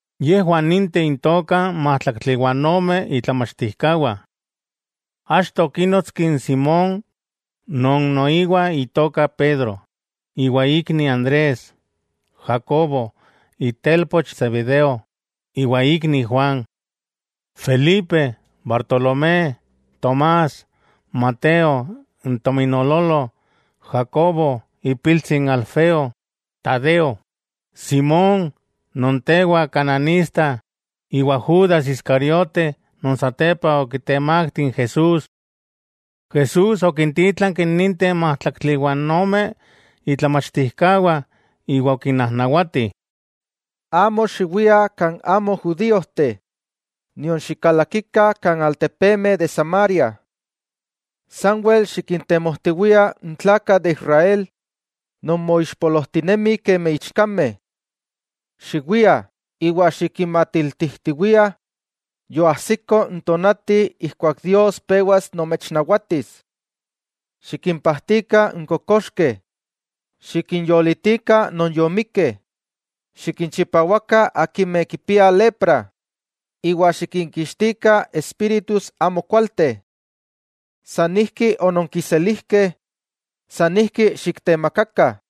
Yejwah ninteh intokah n májtlaktli iwa ome itlamachtijkawah. Achto okínotski n Simón non noiwa itoka Pedro iwa ikni Andrés, Jacobo itelpoch Zebedeo iwa ikni Juan, Felipe, Bartolomé, Tomás, Mateo n tominoololo, Jacobo ipiltsi n Alfeo, Tadeo, Simón, non tewa Kananista, iwa Judas Iscariote non satepa okitemakti n Jesús. Jesús okintítlanki ninteh májtlaktli iwa ome itlamachtijkawah iwa okinnajnawati: —Amo xiwiah kan amo judíojteh, nion xikalakikah kan altepemeh de Samaria. Sanwel xikintemojtiwiah n tlakah de Israel non moixpolojtinemih kemi ichkameh. Xiwiah, iwa xikinmatiltijtiwiah yoajsiko n tonati ijkuak Dios pewas nomechnawatis. Xikimpajtikah n kokoxkeh, xikinyolitikah non yomikkeh, xikinchipawakah akimeh kipiah lepra, iwa xikinkixtikah espíritus amokualteh. San ijki ononkiselijkeh, san ijki xiktemakakah.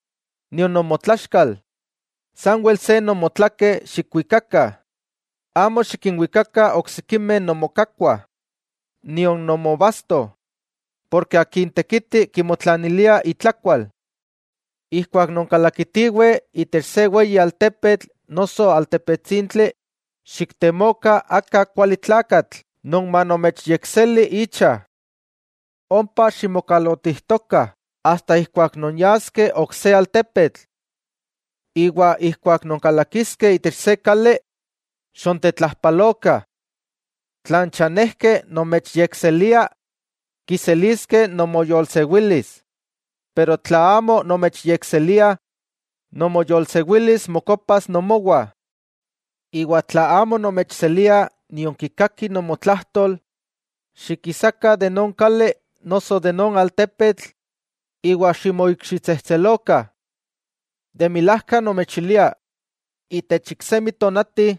nion nomotlaxkal. Sanwel se nomotlakeh xikwikakah. Amo xikinwikakah oksikimeh nomokakkuah, nion nomobasto, porke akin tekiti kimotlanilia itlakual. 'Ijkuak nonkalakitiweh itech se weyi altepetl noso altepetsintli, xiktemokah aka kuali tlakatl non manomechyekseli icha. Ompa ximokalotijtokah asta ijkuak nonyaskeh ok se altepetl. Iwa ijkuak nonkalakiskeh itech se kali, xontetlajpalokah. Tla n chanejkeh nomechyekseliah, kiseliskeh nomoyolsewilis, pero tla amo nomechyekseliah, nomoyolsewilis mokopas nomowah. Iwa tla amo nomechseliah nion kikakih nomotlajtol, xikisakah de non kali noso de non altepetl iwa ximoikxitsejtselokah. De milajka nomechilia, itech iksemi tonati,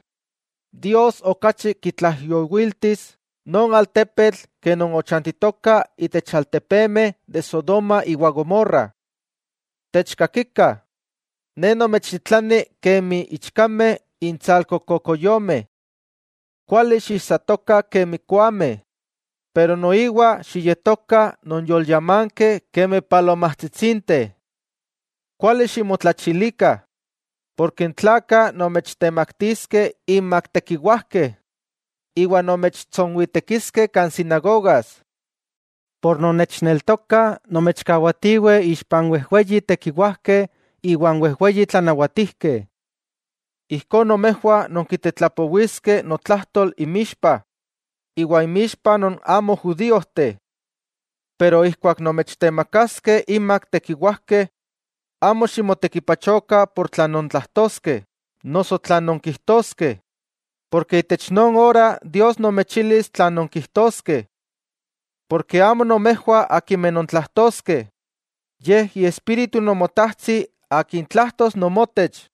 Dios okachi kitlaijyowiltis non altepetl ke non ochantitokah itech altepemeh de Sodoma iwa Gomorra. '¡Techkakikah! Ne nomechtitlani kemi ichkameh intsalko kokoyomeh. Kuali xiijsatokah kemi koameh pero noiwa xiyetokah non yolyamankeh kemi palomajtsitsinteh. Kuali ximotlachilikah, porke n tlakah nomechtemaktiskeh inmak tekiwajkeh, iwa nomechtsonwitekiskeh kan sinagogas. Por non nechneltokah, nomechkawatiweh ixpa n wejweyi tekiwajkeh iwan wejweyi tlanawatijkeh. Ijkó nomejwah nonkitetlapowiskeh notlajtol inmixpah, iwa inmixpa non amo judíojteh. Pero ijkuak nomechtemakaskeh inmak tekiwajkeh, amo ximotekipachokah tlan nontlajtoskeh noso tlan nonkijtoskeh. Porke itech non ora Dios momechilis tlan nonkijtoskeh. Amo nomejwah nontlajtoskeh, yej Iespíritu Nomotajtsi akin tlajtos nomotech.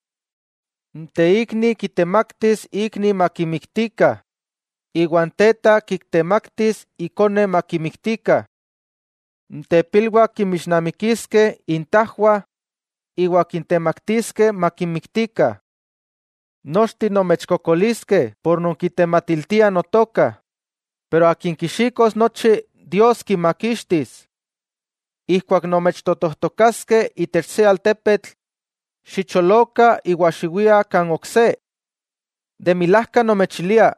'N teikni kitemaktis ikni makimiktikah, iwa n teta kitemaktis ikone makimiktikah. N tepilwah kinmixnamikiskeh intajwah iwa kintemaktiskeh makinmiktikah. Nochteh nomechkokoliskeh por nonkitematiltiah Notoka, pero akin kixikos nochi, Dios kimakixtis. Ijkuak nomechtotojtokaskeh itech se altepetl, xicholokah iwa xiwiah kan ok se. De milajka nomechilia: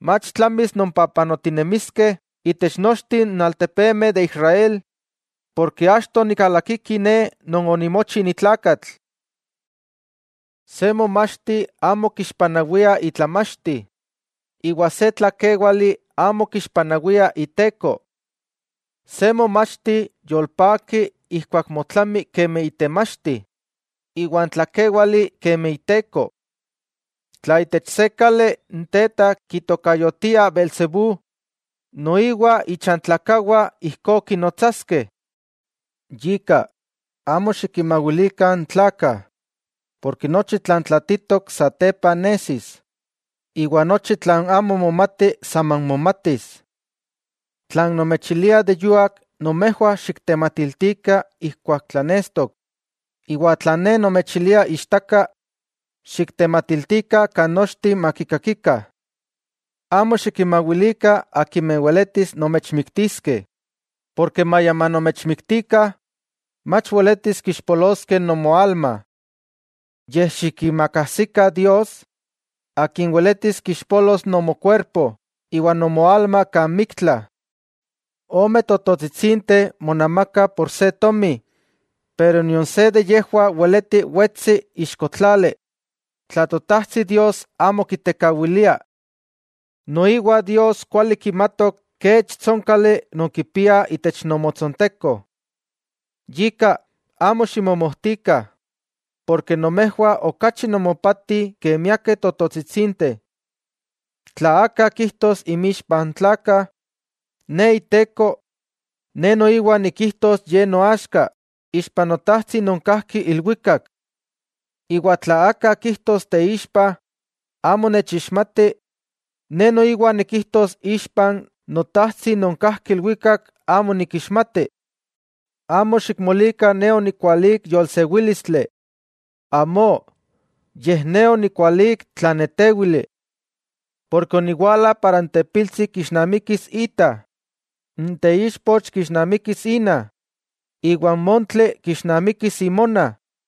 mach tlamis nonpapanotinemiskeh itech nochteh n altepemeh de Israel, porke achto nikalakiki Ne Non onimochi ni tlakatl. 'Se momachti amo kixpanawia itlamachti iwa se tlakéwali amo kixpanawia iteko. Se momachti yolpaki ijkuak motlami kemi itemachti, iwa n tlakéwali kemi iteko. Tla itech se kali, n teta kitokayotiah beelzebú, ¡noiwa ichantlakawah ijkó kinnotsaskeh! 'Yika, amo xikinmawilikah n tlakah. Porke nochi tlan tlatitok satepa nesis, iwa nochi tlan amo momati saman momatis. Tlan nomechilia de yuak, nomejwah xiktematiltikah ijkuak tlanestok. Iwa tlan Ne nomechilia ichtaka, xiktematiltikah chikawak. Amo xikinmawilikah akimeh weletis nomechmiktiskeh, porke maya manomechmiktikah, mach weletis kixpoloskeh nomoalma. Yej xikiimakajsikah Dios Akin weletis kixpolos nomokuerpo iwa nomoalma kan miktla. 'Omeh tototsitsinteh monamakah ika se tomi, pero nion se de yejwah weleti wetsi ixko tlali tla Totajtsi Dios amo kitekawilia. Noiwa Dios kuali kimatok kech tsónkali nonkipiah itech nomotsonteko. Yika, amo ximomojtikah, porke nomejwah okachi nomopatih ke miakeh tototsitsinteh. 'Tla aka kijtos inmixpa n tlakah, Ne Iteko, Ne noiwa nikijtos ye noaxka ixpa n Notajtsi non kajki ilwikak. Iwa tla aka kijtos teixpa, amo nechixmati, Ne noiwa nikijtos ixpan Notajtsi non kajki ilwikak amo nikixmati. 'Amo xikmolikah Ne onikwalík yolsewílistli. Amó, yej Ne onikwalík tlanetéwili. Ne oniwala para n tepiltsi kixnamikis ita, n teichpoch kixnamikis ina, iwa n montli kixnamikis imona.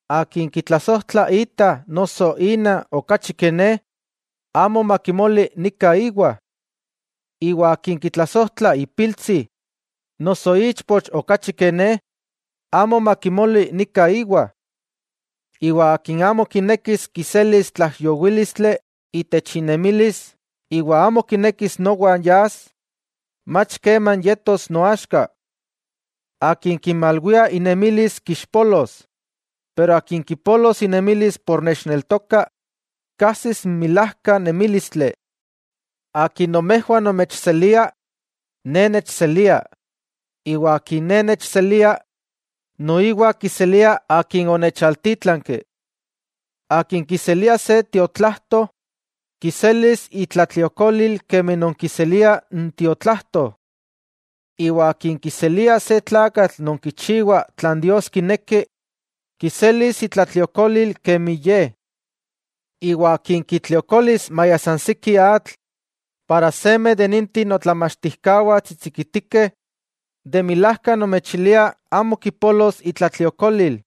'Akin kitlasojtla ita noso ina okachi ke Ne, amo makimoli nika íwa. Iwa akin kitlasojtla ipiltsi noso ichpoch okachi ke Ne, amo makimoli nika íwa. Iwa akin amo kinekis kiselis tlaijyowílistli itech inemilis iwa amo kinekis nowan yas, mach keman yetos noaxka. Akin kimalwia inemilis kixpolos, pero akin kipolos inemilis por nechneltoka, kajsis n milájka nemílistli. 'Akin nomejwah nomechselia, Ne nechselia, iwa akin Ne nechselia, noiwa kiselia Akin onechaltítlanki. Akin kiselia se tiotlajto, kiselis itlatliokolil kemi non kiseliah n tiotlajto. Iwa akin kiselia se tlakatl non kichiwa tlan Dios kineki, kiselis itlatliokolil kemi ye. Iwa akin kitliokolis maya san siki atl, seme de ninteh notlamachtijkawah tsitsikitikeh, de milajka nomechilia amo kipolos itlatliokolil.